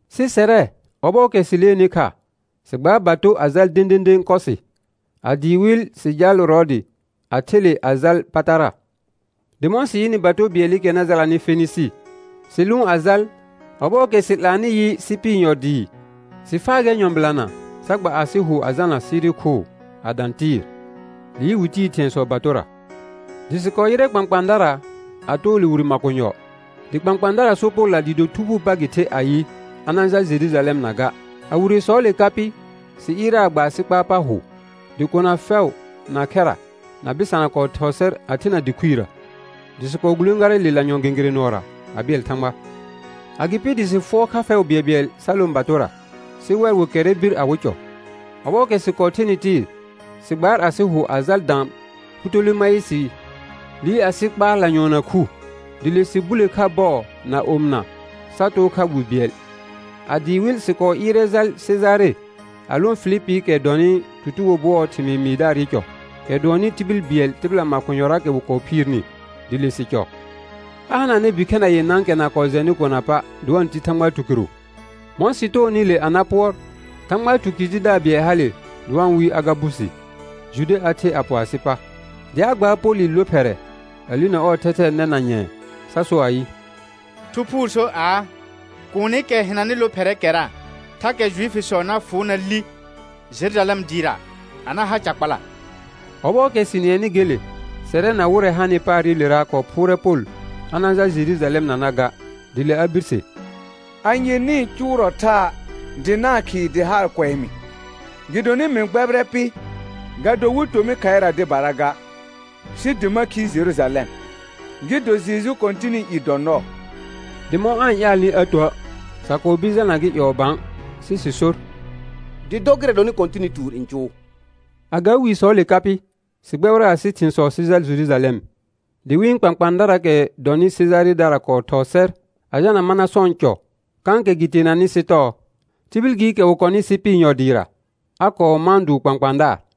Sɩ sɛrɛ ɔbɔɔkɛ sɩ leenɩ kha, sɩ gbaar bato a jal dẽdẽdẽ Kɔsɩ; a dɩɩ wɩl sɩ jaal Rɔɔdɩ a the le a jal Patara. Dɩ mɔ̃ sɩ yɩnɩ bato bɩɛlɩkɛ na jalanɩ Fenɩsɩ, sɩ lʋʋn a jal Ɔbɔɔkɛ sɩ 'laanɩ yɩ Sɩpɩr yɔ dɩɩ, sɩ faa gɛr nyɔ̃bɩlana sa gba asɩ hʋ a jalna Siri khʋʋ a dã Tɩɩr; liir wɩ tiir thɩ̃ɛsɔ batora. Dɩ sɩ kɔɔ yɩrɛ kpãkpãadara a too le wire makonyɔ. Dɩ kpãkpãadara sor Polla dɩɩ do Thu Phuu pa gɩ the ayɩ, a na-n jal Jerujalɛmna ga. A wiresɔɔle ka pɩ, sɩ ɩɩrɛ a gba asɩ kpaar pa hʋ, dɩ kona fɛʋ, na khɛra, na bɩsana kɔɔ thɔɔ sɛr a thena dɩ khuirə. Dɩ sɩ kɔɔ gulẽgarɛ le lanyɔ̃ gẽgerẽ nʋɔra a bɩɛl Thãgba. Agɩpɩ dɩ sɩ fʋɔr kha bɩɛlbɩɛl sa lõ batora, sɩ wɛr wɩ kɛrrɛ bir awɩ cɔ. Ɔbɔɔkɛ sɩ kɔɔ thenɩ Tɩɩr, sɩ gbaar asɩ hʋ a jal dã Pʋtolemaɩsɩ, liir asɩ kpaar lanyʋɔnna khu, dɩ le sɩ bule kha bɔɔ na omɩna sa too kha wi bɩɛl. A dɩɩ wɩl sɩ kɔɔ ɩɩrɛ jal Sejare a lõ Filipiikɛ dɔnɩ tutugo bʋɔɔ thɩmɩɩ mɩɩdaarɩ cɔ, kɛ dʋɔnnɩ tibil bɩɛl tɩbɩla makonyɔraakɛ wɩ kɔɔ phiirni, dɩ le sɩ cɔ. A hananɛ bikhɛna yenãakɛ na kɔɔ jɛnɩ kona pa', dɩ wa-n ti Thãgba tukɩrʋ. Mɔ̃ sɩ toonɩ le a na pʋɔr, Thãgba tukɩr tidaar bɩɛl hale dɩ wa-n wɩɩ Agabusi, Jude a the a pɔ asɩ pa; dɩ a gbaar Polɩ lophɛrɛ a linə ɔɔ thɛthɛɛ nɛ na nyɛ̃ɛ sa so ayɩ: Thu Phuu sor aa: Kuunikɛ hɩnanɩ lophɛrɛɛkɛra, thakɛ Juifisɔ na fʋʋ na li Jerujalɛm dɩɩra a na ha ca kpala. Ɔbɔɔkɛ sɩ nɩɛnɩ gele, sɛrɛ na wɩrɛ hanɩ paarɩlera kɔɔ phʋʋrɛ Pol a na-n jal Jerujalɛmnana ga. Dɩ le a birse: Anye nɩ-n cʋʋrɔ thaa dɩ na-n khɩɩ dɩ haar kʋɛ mɩ? Gɩdonɩ mɩ gbɛbɩrɛ pɩ, ga do wɩ to mɩ khaɩra dɩbara ga, sɩ dɩ ma khi Jerujalɛm, gɩ do Jeju Kɔ̃tɩnɩ i dɔ nɔɔ. Dɩ mɔ̃ aa-n ƴaalnɩ a tuə', sa kɔɔ bir jalna gɩ ƴɔɔ bã sɩ sɩ sor: Dɩ dɔ gɩrɛ dɔnɩ Kɔ̃tɩnɩ tuur n cʋʋ. A ga wisɔɔle ka pɩ, sɩ gbɛbɩrɛ asɩ thɩ̃sɔ sɩ jal Jerujalɛm. Dɩ wɩ̃ kpãkpãadaraakɛ dɔnɩ Sejaredara kɔɔ thɔɔ sɛr a jalna Manasɔ̃ɔ cɔ kãkɛ gɩ teenanɩ sɩ tɔɔ; tibil gɩɩkɛ wɩ kɔnɩ Sɩpɩr yɔ dɩɩra, a kɔɔ mãa dʋʋr kpãkpãadaar.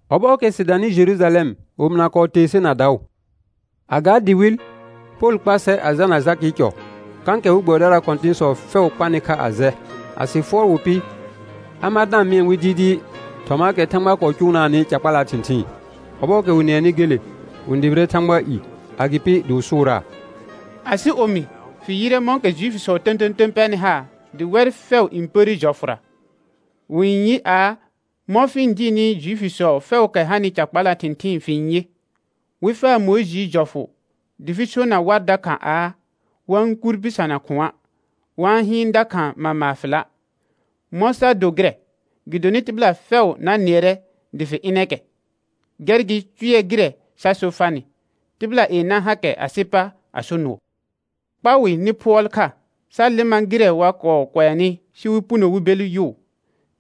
Ɔbɔɔkɛ sɩ danɩ Jerujalɛm, omɩna kɔɔ tee ser na daʋ. A ga dɩ wɩl, Pol kpa sɛr a jalna Jakɩɩ cɔ, kãkɛ we gbɛbɩdaraa kɔ̃tɩ̃sɔ fɛʋ kpanɩ kha a jɛ. A sɩ fʋɔr wɩ pɩ, a mar da-n mɩɛ wɩ dɩɩdɩɩ thɔmaakɛ Thãgba kɔɔ cʋʋnaanɩ ca kpalaa thɩ̃thɩɩn. Ɔbɔɔkɛ wɩ nɩɛnɩ gele, wɩ-n dʋbɩrɛ Thãgbaa i; agɩpɩ dɩ wɩ sʋʋraa: Asɩ omi, fɩ yɩrɛ mɔ̃kɛ Juifisɔ tə̃tə̃tə̃ pɛrnɩ haar, dɩ wɛr fɛʋ n pərre jɔfʋra. Wɩ-n yɩ aa, mɔ̃ fɩ-n dɩɩrnɩ Juifisɔ fɛʋʋkɛ hanɩ ca kpalaa thɩ̃thɩɩn fɩ-n yɩ, wɩ faa Mʋɩjɩɩ jɔfʋ dɩ fɩ sona war dakha aa, wa-n kur bɩsana khʋ̃a', wa-n hɩɩn dakha mama fɩla'. Mɔ̃ sa do gɩrɛ, gɩdonɩ tɩbɩla fɛʋ na nɩɛrɛ dɩ fɩ ɩnɛ kɛ. Gɛr gɩ, cʋɛ gɩrɛ sa so farnɩ: Tɩbɩla yenã hakɛ asɩ pa a so nʋɔ. Kpa wɩ nɩ phʋɔl kha, sa lɩma gɩrɛ wa kɔɔ kʋɛnɩ sɩ wɩ puno wɩ bel yʋʋ.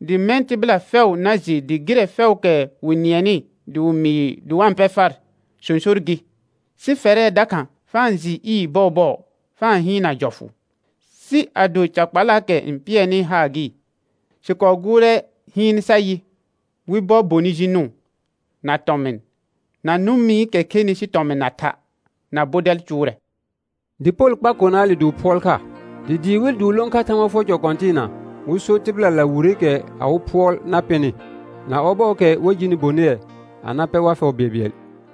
Dɩ mɛ̃ tɩbɩla fɛʋ na jɩ dɩ gɩrɛ fɛʋʋkɛ wɩ nɩɛnɩ dɩ wɩ mɩɩ dɩ wa-n pɛ far, sõsor gɩ, sɩ fɛrɛ dakha fa-n jɩɩ ɩɩr bɔɔbɔɔ fa-n hɩɩnna jɔfʋ. Sɩ ado ca kpalaakɛ n pɩɛrnɩ haar gɩ, sɩ kɔɔ gʋʋrɛ hɩɩn sa yɩ, wɩ bɔ bonɩ ji nʋʋn, na tɔmɩn, na nʋmɩkɛ khenɩ sɩ tɔmɩn na tha', na bɔdɛl cʋʋrɛ. Dɩ Pol kpar konaale dɩ wɩ phʋɔl kha, dɩ dɩɩ wɩl dɩ wɩ lõ kha Thãgba fʋɔr cɔ kɔ̃tɩɩna wɩ so tɩbɩlala wireekɛ awɩ phʋɔl na pɩnɩ, na ɔbɔɔkɛ wa jini bonɩɛ a na pɛ war fɛʋ bɩɛlbɩɛl.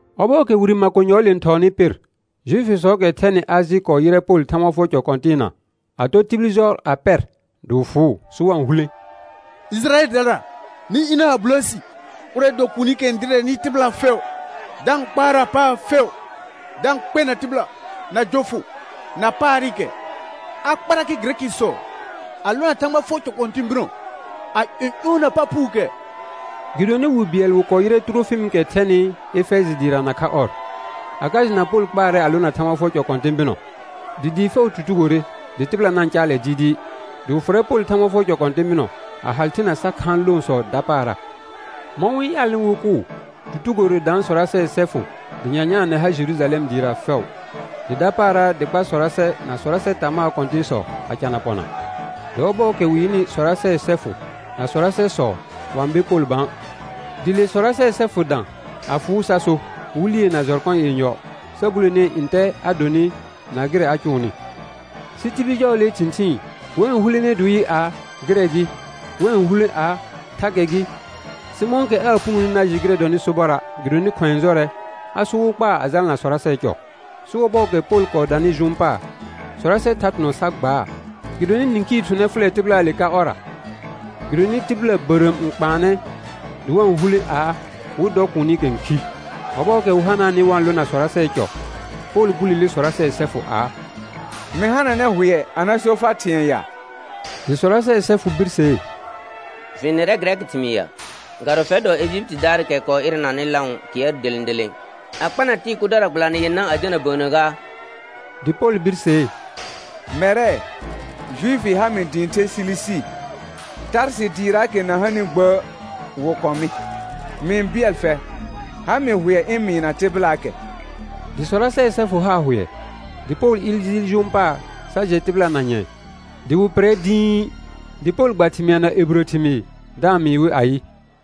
Ɔbɔɔkɛ wire makonyɔɔle n thɔɔnɩ pɩr, Juifisɔɔkɛ thɛnɩ Ãjɩ kɔɔ yɩrɛ Pol Thãgba fʋɔr cɔ kɔ̃tɩɩna, a tɔ tibil jɔ a pɛr dɩ wɩ fʋʋ, sɩ wa-n hulẽ: Ɩjɩrayɛldara, nɩ ɩna a bulo si. Ʋrɛ dɔ kuunikɛ n dɩrɛnɩ tɩbɩla fɛʋ da-n kpaarna paar fɛʋ da-n kpɛna tɩbɩla, na jɔfʋ, na paarɩkɛ. A kparrakɛ Gɩrɛkɩsɔ a lona Thãgba fʋɔr cɔ kɔ̃tɩ̃ bɩnɔ a ƴɔ̃ƴɔɔna pa phuukɛ. Gɩdonɩ wi bɩɛl wɩ kɔɔ yɩrɛ Tʋrofɩmɩkɛ dɔnɩ Efɛjɩdaar dɩɩra nakha ɔr, a ka jɩna Pol kpaarɛ a lona Thãgba fʋɔr cɔ kɔ̃tɩ̃ bɩnɔ. Dɩ dɩɩ fɛʋ tutugore, dɩ tɩbɩla na-n caalɛ dɩɩdɩɩ. Dɩ wɩ fʋrɛ Pol Thãgba fʋɔr cɔ kɔ̃tɩ̃ bɩnɔ, a hal thena sa khaan loosɔ dapaara. Mɔ̃ wɩ n ƴaalnɩ wɩ kʋʋ, tutugore daan sɔrasɛɛ sɛfʋ dɩ nyanyaanɛ har Jerujalɛm dɩɩra fɛʋ. Dɩ dapaara dɩ kpa sɔrasɛ na sɔrasɛ tamaa kɔ̃tɩ̃sɔ, a cana pɔna. Dɩ ɔbɔɔkɛ wɩ yɩnɩ sɔrasɛɛ sɛfʋ na sɔrasɛsɔ wa-n be Pol bã. Dɩ le sɔrasɛɛ sɛfʋ dã a fʋʋ sa so, wɩ lie na jɔrkɔ yenyɔ sa bulee ntɛ a donɩ na gɩrɛ a cʋʋnɩ. Sɩ tibil jɔɔlee thɩ̃thɩɩn, wɛ n hulene dɩ wɩ yɩ aa: Gɩrɛ gɩ; wɛ n hulẽ aa: Thakɛ gɩ; sɩ mɔ̃kɛ aa punoni na jɩ gɩrɛ dɔnɩ sobɔra' gɩdonɩ khʋ̃ɛ jɔrɛ, a sor wɩ kpaa a jalana sɔrasɛɛ cɔ. Sɩ ɔbɔɔkɛ Pol kɔɔ danɩ jʋʋn paar, sɔrasɛ thar thʋnɔ sa gbaa, gɩdonɩ nĩkhii thʋnɛ fʋlɛ tɩbɩlaale ka ɔrra. Gɩdonɩ tɩbɩla bərəəm n kpaanɛ dɩ wa-n hulẽ aa, wɩ dɔ kuunikɛ n khi. Ɔbɔɔkɛ wɩ hanaanɩ wa-n lona sɔrasɛɛ cɔ, Pol bulele sɔrasɛɛ sɛfʋ aa: Mɩ hananɛ hʋɛ a na so far thɩ̃ɛ ya? Dɩ sɔrasɛɛ sɛfʋ birsee: Fɩ-n nɩrɛ gɩrɛkɩ thɩmɩɩr ya? Ga do fɛr dɔ Ejipitidaarɩkɛ kɔɔ ɩrɛnanɩ lãʋ kɩɛr delẽ delẽ, a kpana tɩɩ kʋdara gbɩlanɩ yenã a jalna bəənnə gaa? Dɩ Pol birsee: Mɛrɛ, Juifi ha mɩ dɩ ɩ̃ the Silisi, Tarsɩ dɩɩraakɛ na hanɩ gbə' wɩ kɔ̃ mɩ; mɩ-n bɩɛl fɛr, ha mɩ hʋɛ ɩ̃ mɩɩna tɩbɩlaakɛ. Dɩ sɔrasɛɛ sɛfʋ haa hʋɛ, dɩ Pol ɩɩr jɩɩl jʋʋn paar sa jɛ tɩbɩla na nyɛ̃ɛ. Dɩ wɩ pɩrrɛ dĩi, dɩ Pol gba thɩmɩa na ebirə thɩmɩɩr da-n mɩɩ wɩ ayɩ: